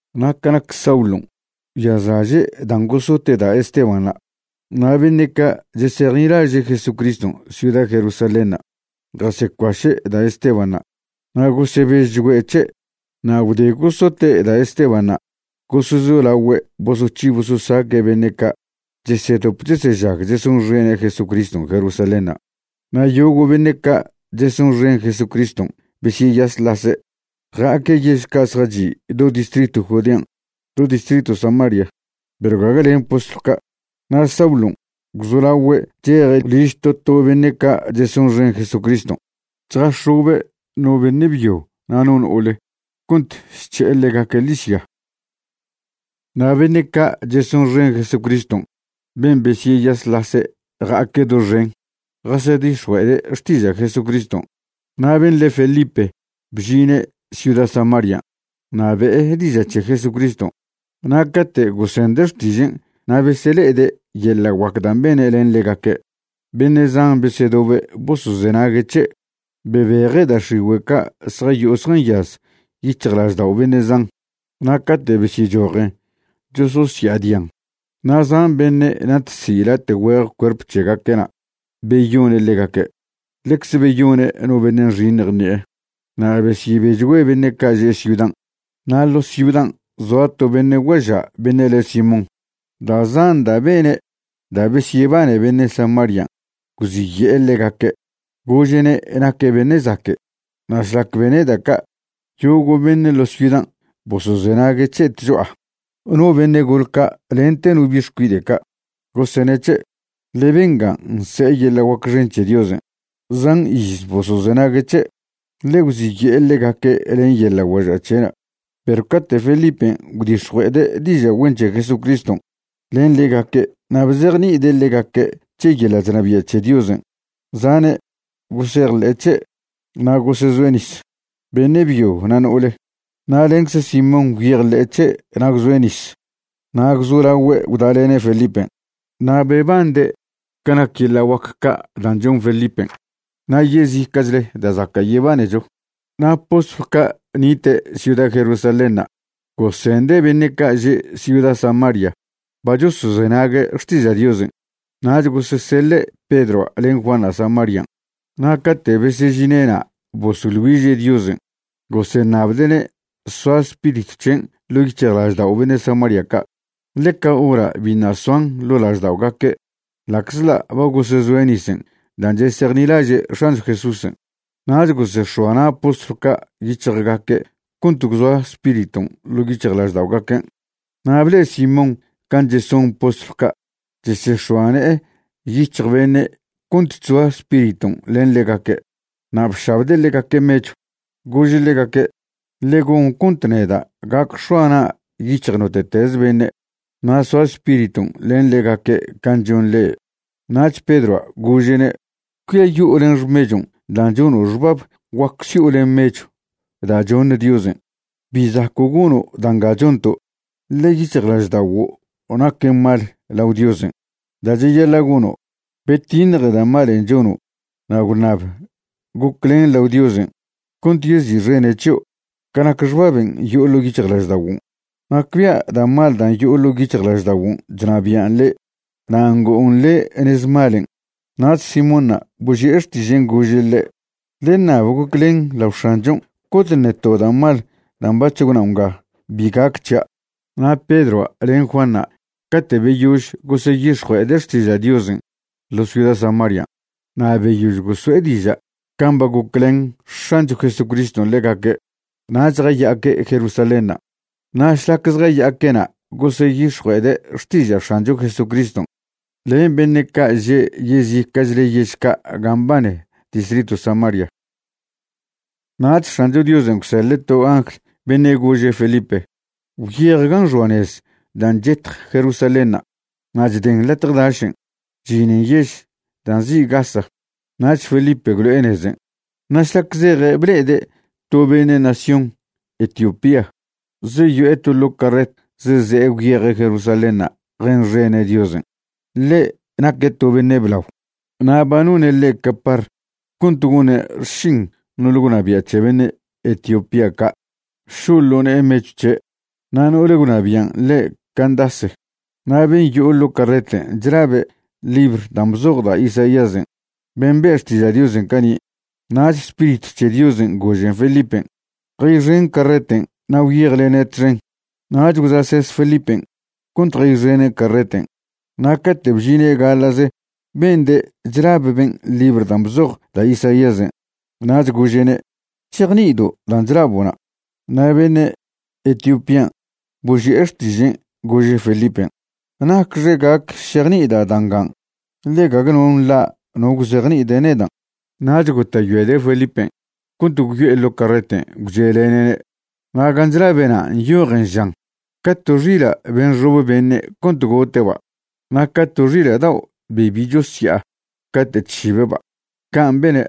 Na' ca nac Saulon', gwyazlaže' dan' gosote' da' Estebanṉa'. Na' beṉe' ca' chesejnilaže' Jesucriston' ciuda Jerusalénṉa' jasecuaše' da' Estebanṉa', na' gosebežchgüe' c̱he'. Na' gwde gosote' da' Estebanṉa' gosezolagüe' bosoc̱hi bososaque' beṉe' ca' chesedop chesežag chesonxene' Jesucriston' Jerusalénṉa', na' yogo' beṉe' ca' chesonxen Jesucriston' besyeyasḻase', ja'aque' yež ca' zjachi' do distritw Judean', do distritw Samaria, perw gague len postlw ca'. Na' Saulon' gwzolagüe' cheje' liž to to beṉe' ca' chesonxen Jesucriston' chjax̱obe' no beṉe' byo na' no no'ole cont chc̱he'e ḻegaque' ḻižya. Na' beṉe' ca' chesonxen Jesucriston' ben' besyeyasḻase' ja'aque' doxen, jasedix̱jue'ede' xtiža' Jesucriston'. Na' ben' le Felipe bžine' ciuda Samarian' na' be'e diža' c̱he Jesucriston'. Na' cate' gosende' xtižen' na' besele'ede' yeḻa' guac dan' bene' len ḻegaque', beṉe' zan besedobe' bosozenague' c̱he'. Bebeje' da' x̱igüe' ca' zjayo'o zjanyaz yic̱hjlaždao' beṉe' zan, na' cate' besyechojen chososya'adian. Na' zan beṉe' natzi' late' güeje cuerp c̱hegaque'na' beyone' ḻegaque', ḻecze beyone' no beṉe' nxiṉj ṉi'e. Na' besyebechgüe beṉe' ca' že' ciudan'. Na' ḻo ciudan' zoa to beṉe' guaža' beṉe' le Simón. Da' zan da' bene' da' besyebane beṉe' Samarian' gwziye'e ḻegaque' gože'ne' naque' beṉe' zaque'. Na' šlac bene' da' ca', yogo' beṉe' ḻo ciudan' bosozenague' c̱he' tcho'a, no beṉe' gole ca' lente no bi' xcuide' ca', gosene' c̱he': ―Ḻe bengan' nse'e yeḻa' guac xen c̱he Diosen'. Zan iz bosozenague' c̱he', ḻe gwziye'e ḻegaque' len yeḻa' guaža' c̱he'na'. Perw cate' Felipen' gwdix̱jue'ede' diža' güen c̱he Jesucriston' len ḻegaque' na' bzejni'ide' ḻegaque' c̱he yeḻa' chnabia' c̱he Diosen', zane' gosejḻe'e c̱he' na' gosezoe' nis, beṉe' byo na' no'ole. Na' lencze Simón gwyejḻe'e c̱he' na' gwzoe' nis na' gwzolaogüe' gwdalene' Felipen', na' bebande' ca nac yeḻa' guac ca' dan' chon Felipen' na' yezica'chle da' zaca' yebanecho. Na' postlw ca' nite' ciuda Jerusalénṉa' gosende' beṉe' ca' že' ciuda Samaria ba chosozenague' xtiža' Diosen', nach goseseḻe' Pedroa' len Juanṉa' Samarian'. Na' cate' besežine'na' bosoḻ güiže' Diosen' goseṉabde'ne' soa Spiritw c̱hen' ḻo' yic̱hjlaždao' beṉe' Samaria ca', ḻe ca hora' biṉa' soan ḻo' lažda'ogaque' ḻa'czḻa' ba gosezoe' nisen' dan' chesejnilaže' X̱ancho Jesúsen'. Nach gosex̱oa na' postlw ca' yic̱hjgaque' cont gwzoa Spiriton' ḻo' yic̱hjlažda'ogaquen'. Na' ble'e Simón can' cheson postlw ca' chesex̱oa ne'e yic̱hj beṉe' cont chzoa Spiriton' len ḻegaque', na' bšabde' ḻegaque' mechw. Gože' ḻegaque': ―Ḻe gon cont neda' gac x̱oa na'a yic̱hj note'teze beṉe' na' soa Spiriton' len ḻegaque' can' chon le'e. Nach Pedroa' gože'ne': ―Cuiayo'o len xmechon' dan' chono' xbab guac si'o len mechw da' choṉ Diosen'. Bi zaco' gono' da' nga chonto', ḻe yic̱hjlažda'oguo' naquen mal lao Diosen'. Da' cheyaḻa' gono', betiṉje da' malen' chono' na' gwṉab goclen lao Diosen' cont yezi'xene' c̱hio' ca nac xbaben' yo'o ḻo' yic̱hjlažda'oguon'. Nacbia' da' mal dan' yo'o ḻo' yic̱hjlažda'oguon' chnabi'an le' na' ngo'on le' nez malen'. Nach Simónṉa' boži'e xtižen' gože' ḻe': ―Ḻe ṉab goclen lao X̱anchon' cont ṉe to da' mal dan' bac̱h gwnao' nga bi gac c̱hia'. Na' Pedroa' len Juanṉa' cate' beyož goseyix̱jue'ede' xtiža' Diosen' ḻo ciuda Samarian' na' beyož goso'e diža' can' ba goclen X̱ancho Jesucriston' ḻegaque', nach jaya'aque' Jerusalénṉa'. Na' šlac zjaya'aque'na' goseyix̱jue'ede' xtiža' X̱ancho Jesucriston' len beṉe' ca' že' yezica'chle yež ca' gan' mbane distritw Samaria. Nach X̱ancho Diosen' gwseḻe' to angl beṉe' gože' Felipe: ―Gwyej gan' xoa nez dan' chetj Jerusalénṉa' na' chden latje dašen' chžinen yež dan' nzi' Gaza. Nach Felipe gwlo'e nezen', na' šlac zeje' ble'ede' to beṉe' nación Etiopía zeyo'e to ḻo' carret zeze'e gwyeje' Jerusalénṉa' jenxene' Diosen'. Ḻe' naque' to beṉe' blao na' ba none' ḻe' capar cont gone' xšin no'ole gwnabia' c̱he beṉe' Etiopía ca', šo'o ḻo ne'e mechw c̱he'. Na' no'ole gwnabian' le' Candace. Na' ben' yo'o ḻo' carreten' chlabe' libr dan' bzoj da' Isaíasen' ben' be' xtiža' Diosen' cani'. Nach Spiritw c̱he Diosen' gožen Felipen': ―Jayxen carreten' na' gwyejlene' txen. Nach gwza'ses Felipen' cont jayxene' carreten' na' cate' bžine' gaḻa'ze bende' chlab ben' libr dan' bzoj da' Isaíasen'. Nach gože'ne': ―¿Chejni'ido' dan' chlabo'na'? Na' beṉe' Etiopían' boži'e xtižen' gože' Felipen': ―¿Nacxe gac šejni'ida' da' ngan', ḻe gague no nḻa' no gwzejni'ide' nedan'? Nach gota'yoede' Felipen' cont gwyo'e ḻo' carreten' gwche'lene'ne'. Na' gan' chlabe'na' nyojen žan: Ca to xila' be nxob beṉe' cont gote'ba', na' ca to xila' dao' be bi chosya'a cate' chšibe'ba', can' bene',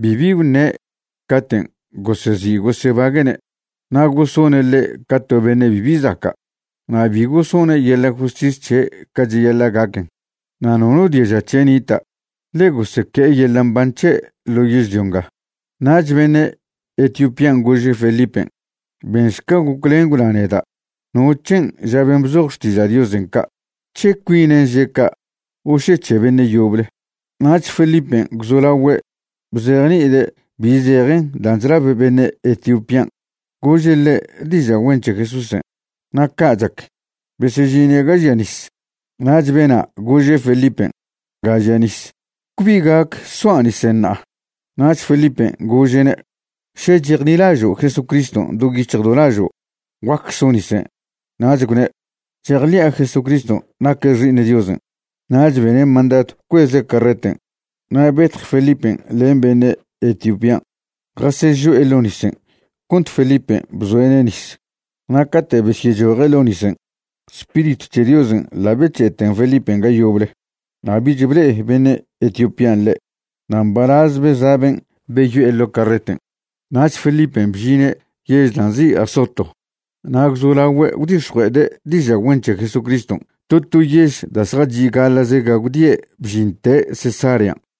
bibi gwṉe' caten' gosezi' gosebague'ne'. Na' gosone' ḻe' ca to beṉe' bibi zaca'. Na' bi gosone' yeḻa' justis c̱he' ca cheyaḻa' gaquen. Na' nono diaža c̱he' nita', ḻe goseque'e yeḻa' mban c̱he' ḻo yežlio nga. Nach beṉe' Etiopían' gože' Felipen': ―Benšca goclen gwna neda' no c̱hen' ža ben' bzoj Xtiža' Diosen' ca', ¿c̱he cuinen' že' ca' o še c̱he beṉe' yoble? Nach Felipen' gwzolagüe' bzejni'ide' bi zejen dan' chlab beṉe' Etiopían', gože' ḻe' diža' güen c̱he Jesúsen'. Na' ca' chac, besežine' ga žia nis, nach bena' gože' Felipen': ―Nga žia nis, ¿cbi gac soa' nisen' ṉa'a? Nach Felipen' gože'ne': ―Še chejnilažo' Jesucriston' do yic̱hj do lažo', guac so' nisen'. Nach gwne': ―Chejḻi'a Jesucriston' naque' xi'iṉ Diosen'. Nach bene' mandadw bcueze' carreten' na' betj Felipen' len beṉe' Etiopían' jasežo'e ḻo' nisen' cont Felipen' bzoe'ne' nis. Na' cate' besyechoje' ḻo' nisen', Spiritw c̱he Diosen' ḻa' bec̱he'eten Felipen' ga yoble, na' bich ble'e beṉe' Etiopían' ḻe'. Na' mbalaz beza' ben' beyo'e ḻo' carreten'. Nach Felipen' bžine' yež dan' nzi' Azoto na' gwzolagüe' gwdix̱jue'ede' diža' güen c̱he Jesucriston' to to yež da' zjachi' gaḻa'ze ga gwdie' bžinte' Cesarean'.